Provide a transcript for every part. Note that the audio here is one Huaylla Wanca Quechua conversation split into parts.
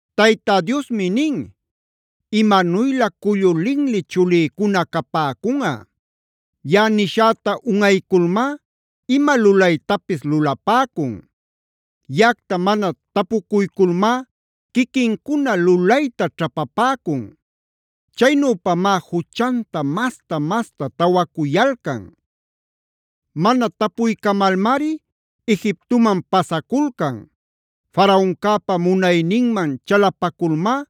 Tayta Diosmi nin: “¡Imanuylä cullu linli chulïcuna capäcunꞌa! Yaꞌa nishäta unꞌayculmá ima lulaytapis lulapäcun. Yaꞌacta mana tapucuyculmá quiquincuna lulayta ćhapapäcun. Chaynüpamá juchanta masta-masta tawacuyalcan. Mana tapuycamalmari Egiptoman pasaculcan; Faraoncäpa munayninman chalapaculmá,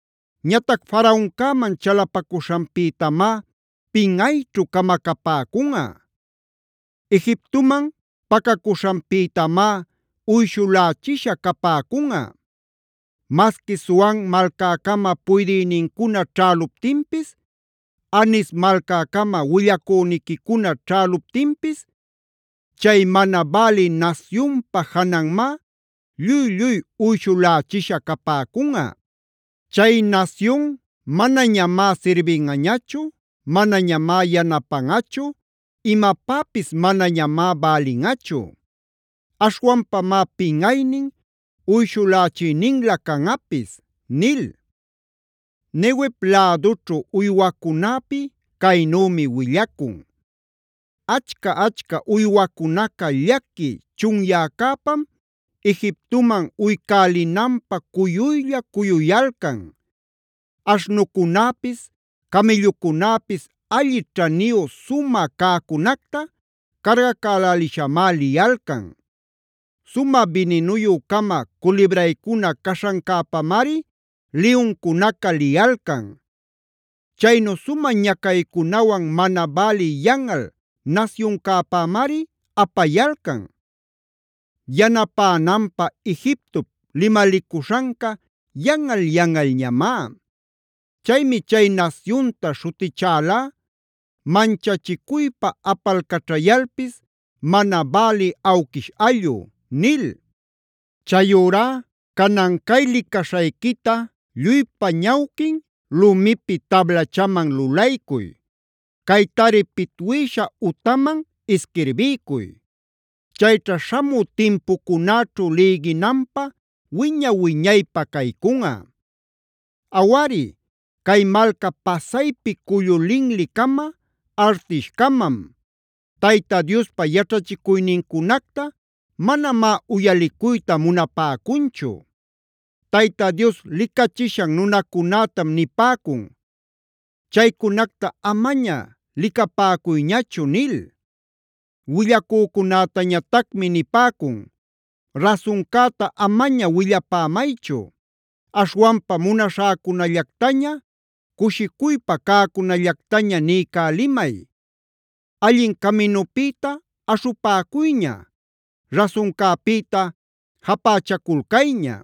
Ñatac Faraoncäman chalapacuśhanpïtamá pinꞌayćhu camacapäcunꞌa; Egiptoman pacacuśhanpïtamá uyshulächisha capäcunꞌa. Masqui Zoan malcäcama puydïnincuna ćhäluptinpis, Hanes malcäcama willacüniquicuna ćhäluptinpis, chay mana bälï nasyunpä jananmá lluy-lluy uyshulächisha capäcunꞌa. Chay nasyun manañamá sirbinꞌañachu, manañamá yanapanꞌachu, imapäpis manañamá bälinꞌachu. Aśhwanpamá pinꞌaynin, uyshulächïninlä canꞌapis” nil. Neguev lädućhu uywacunäpi caynümi willacun: Achca-achca uywacunaca llaqui chunyäcäpam Egiptoman uycälinanpä cuyuylla-cuyuyalcan; aśhnucunäpis, camïllucunäpis alli ćhaniyu sumä cäcunacta cargacälälishamá liyalcan. Sumä bininuyü-cama culibraycuna caśhancäpamari liyuncunaca liyalcan. Chaynu sumä ñacaycunawan mana bälï yanꞌal nasyuncäpämari apayalcan. Yanapänanpä Egiptop limalicuśhanca yanꞌal-yanꞌalñamá. Chaymi chay nasyunta śhutichälá: “Manchachicuypab apalcaćhayalpis mana bälï awquish allꞌu” nil. Chayurá canan cay licaśhayquita lluypa ñawquin lumipi tablachaman lulaycuy; caytari pitwïsha utaman isquirbiycuy. Chayćha śhamü timpucunäćhu lïginanpä wiña-wiñaypä caycunꞌa. Awari, cay malca pasaypi cullu linli-cama, artish-camam; Tayta Diospa yaćhachicuynincunacta manamá uyalicuyta munapäcunchu. Tayta Dios licachishan nunacunätam nipäcun: “Chaycunacta amaña licapäcuyñachu” nil. Willacücunätañatacmi nipäcun: “Rasuncäta amaña willapämaychu. Aśhwanpa munaśhäcunallactaña, cushicuypa cäcunallactaña niycälimay. Allin caminupïta aśhupäcuyña; rasuncäpïta japachaculcayña.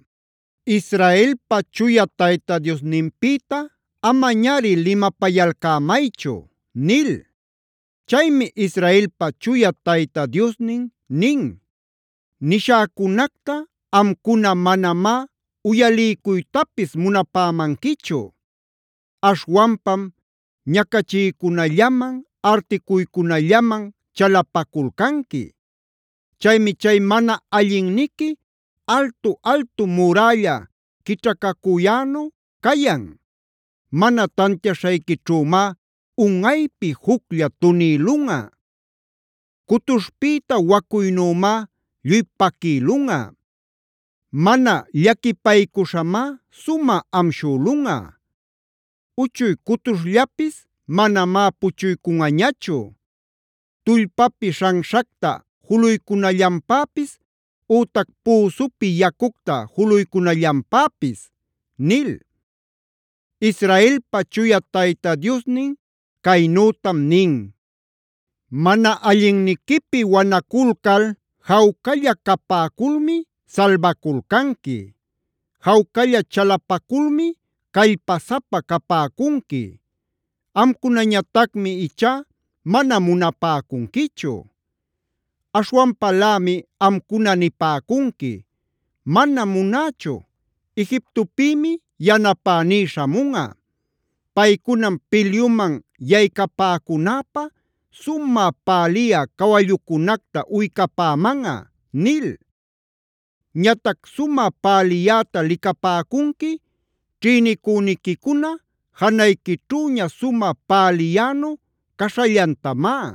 Israelpa Chuya Tayta Diosninpïta amañari limapayalcämaychu” nil. Chaymi Israelpa Chuya Tayta Diosnin nin: “Nishäcunacta amcuna manamá uyaliycuytapis munapämanquichu. Aśhwanpam ñacachiycunallaman, articuycunallaman chalapaculcanqui. Chaymi chay mana allinniqui altu-altu murälla quićhacacuyänu cayan; mana tantiaśhayquićhümá unꞌaypi juclla tunïlunꞌa. Cutuśhpïta wacuynümá lluy paquïlunꞌa; mana llaquipaycuśhamá sumä amshülunꞌa. Uchuy cutuśhllapis manamá puchuycunꞌañachu tullpapi śhanśhacta juluycunallanpäpis ütac püsupi yacucta juluycunallanpäpis” nil. Israelpa Chuya Tayta Diosnin caynütam nin: “Mana allinniquipi wanaculcal jawcalla capäculmi salbaculcanqui. Jawcalla chalapaculmi callpasapa capäcunqui. Amcunañatacmi ichá mana munapäcunquichu. Aśhwanpalämi amcuna nipäcunqui: ‘Manam munächu; Egiptopïmi yanapäní śhamunꞌa. Paycunam pilyuman yaycapäcunäpä sumä päliyä cawallucunacta uycapämanꞌa’ nil. Ñatac sumä päliyäta licapäcunqui, ćhïnicüniquicuna janayquićhüña sumä päliyänu caśhallantamá.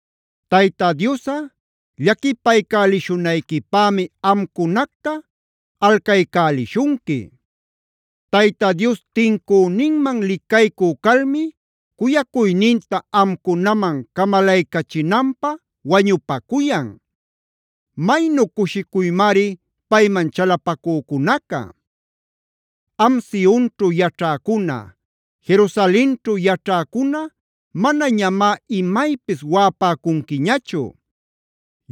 Tayta Diosꞌa llaquipaycälishunayquipämi amcunacta alcaycälishunqui. Tayta Dios tincüninman licaycü calmi cuyacuyninta amcunaman camalaycachinanpä wañupacuyan. Maynu cushicuymari payman chalapacücunaca. Am, Sionćhu yaćhäcuna, Jerusalenćhu yaćhäcuna manañamá imaypis waꞌapäcunquiñachu.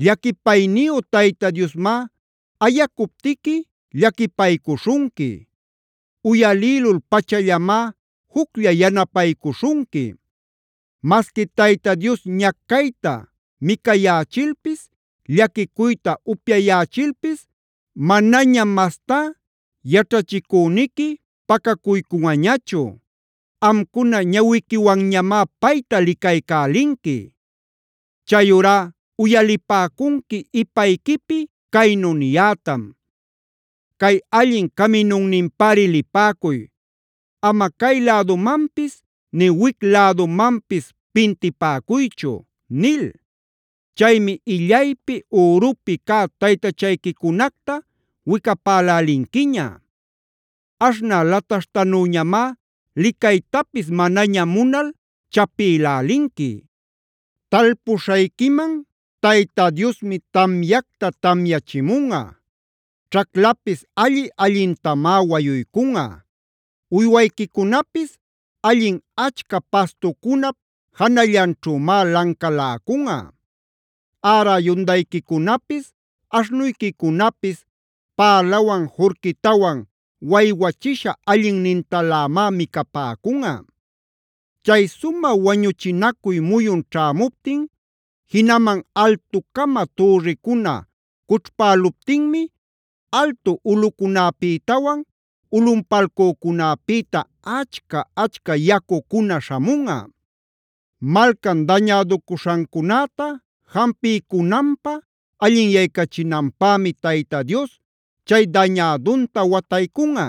Llaquipayniyu Tayta Diosmá ayacuptiqui llaquipaycuśhunqui; uyalïlul pachallamá juclla yanapaycuśhunqui. Masqui Tayta Dios ñacayta micayächilpis, llaquicuyta upyayächilpis manañam mastá yaćhachicüniqui pacacuycunꞌañachu. Amcuna ñawiquiwanñamá payta licaycälinqui. Chayurá uyalipäcunqui ipayquipi caynu niyätam: “Cay allin caminunninpari lipäcuy. Ama cay lädumanpis nï wic lädumanpis pintipäcuychu” nil. Chaymi illaypi, ürupi cä taytachayquicunacta wicapälälinquiña. Aśhnä lataśhtanüñamá licaytapis manaña munal chapilälinqui. Talpuśhayquiman Tayta Diosmi tamyacta tamyachimunꞌa; ćhaclapis alli-allintamá wayuycunꞌa. Uywayquicunapis allin achca pastucunap janallanćhümá lancaläcunꞌa. Ärä yundayquicunapis, aśhnuyquicunapis pälawan jurquitawan waywachisha allinnintalämá micapäcunꞌa. Chay sumä wañuchinacuy muyun ćhämuptin, jinaman altucama türricuna cućhpäluptinmi altu ulꞌucunäpïtawan ulꞌunpalcücunäpïta achca-achca yacucuna śhamunꞌa. Malcan dañäducuśhancunäta jampiycunanpä, allinyaycachinanpämi Tayta Dios chay dañädunta wataycunꞌa.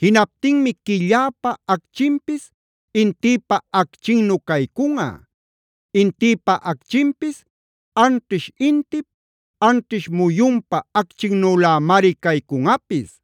Jinaptinmi quilläpa acchinpis intïpa acchinnu caycunꞌa; intïpa acchinpis anćhish intip, anćhish muyunpa acchinnülämari caycunꞌapis.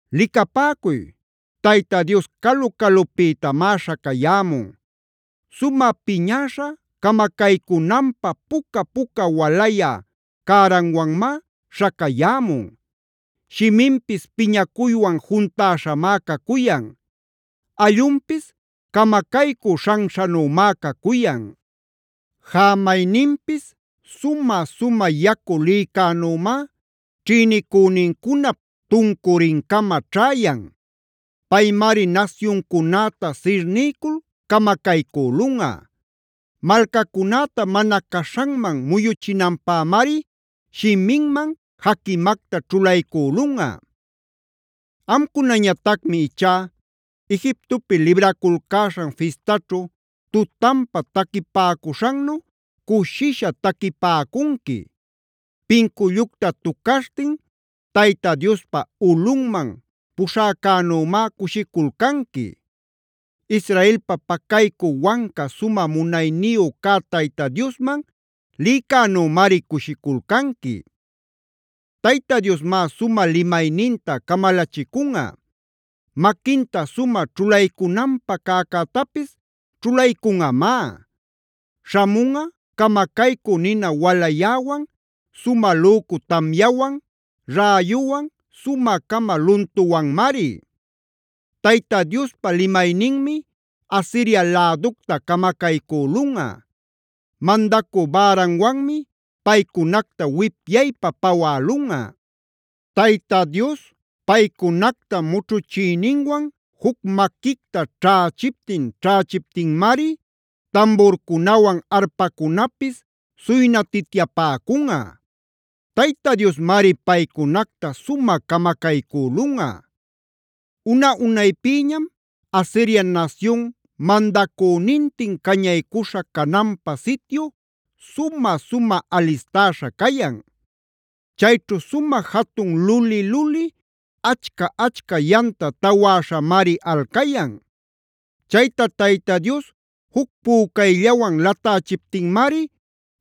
¡Licapäcuy, Tayta Dios calu-calupïtamá śhacayämun! Sumä piñäśha, camacaycunanpä puca-puca walayä cäranwanmá śhacayämun. Shiminpis piñacuywan juntäśhamá cacuyan; allunpis camacaycü śhanśhanümá cacuyan. Jämayninpis sumä-sumä yacu lïcänümá ćhïnicünincunap tuncurincama ćhäyan. Paymari nasyuncunäta sirniycul camacaycülunꞌa. Malcacunäta mana caśhanman muyuchinanpämari shiminman jaquimacta ćhulaycülunꞌa. Amcunañatacmi ichá Egiptopi Libraculcäśhan Fistaćhu tutanpa taquipäcuśhannu cushisha taquipäcunqui. Pincullucta tucaśhtin Tayta Diospa ulꞌunman puśhäcänumá cushiculcanqui. Israelpa pacaycü wanca sumä munayniyu cä Tayta Diosman lïcänümari cushiculcanqui. Tayta Diosmá sumä limayninta camalachicunꞌa; maquinta sumä ćhulaycunanpä cäcätapis ćhulaycunꞌamá. Śhamunꞌa camacaycü nina walayäwan, sumä lücu tamyawan, räyuwan, sumä-cama luntuwanmari. Tayta Diospa limayninmi Asiria läducta camacaycülunꞌa; mandacü bäranwanmi paycunacta wipyaypa pawälunꞌa. Tayta Dios paycunacta mućhuchiyninwan juc maquicta ćhächiptin-ćhächiptinmari, tamburcunawan arpacunapis suynatityapäcunꞌa. Tayta Diosmari paycunacta sumä camacaycülunꞌa. Una-unaypïñam Asiria nasyun mandacünintin cañaycuśha cananpä sityu, sumä-sumä alistäśha cayan. Chayćhu sumä jatun luli-luli, achca-achca yamta tawäśhamari alcayan. Chayta Tayta Dios juc pücayllawan latächiptinmari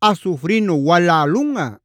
asufrinu walälunꞌa.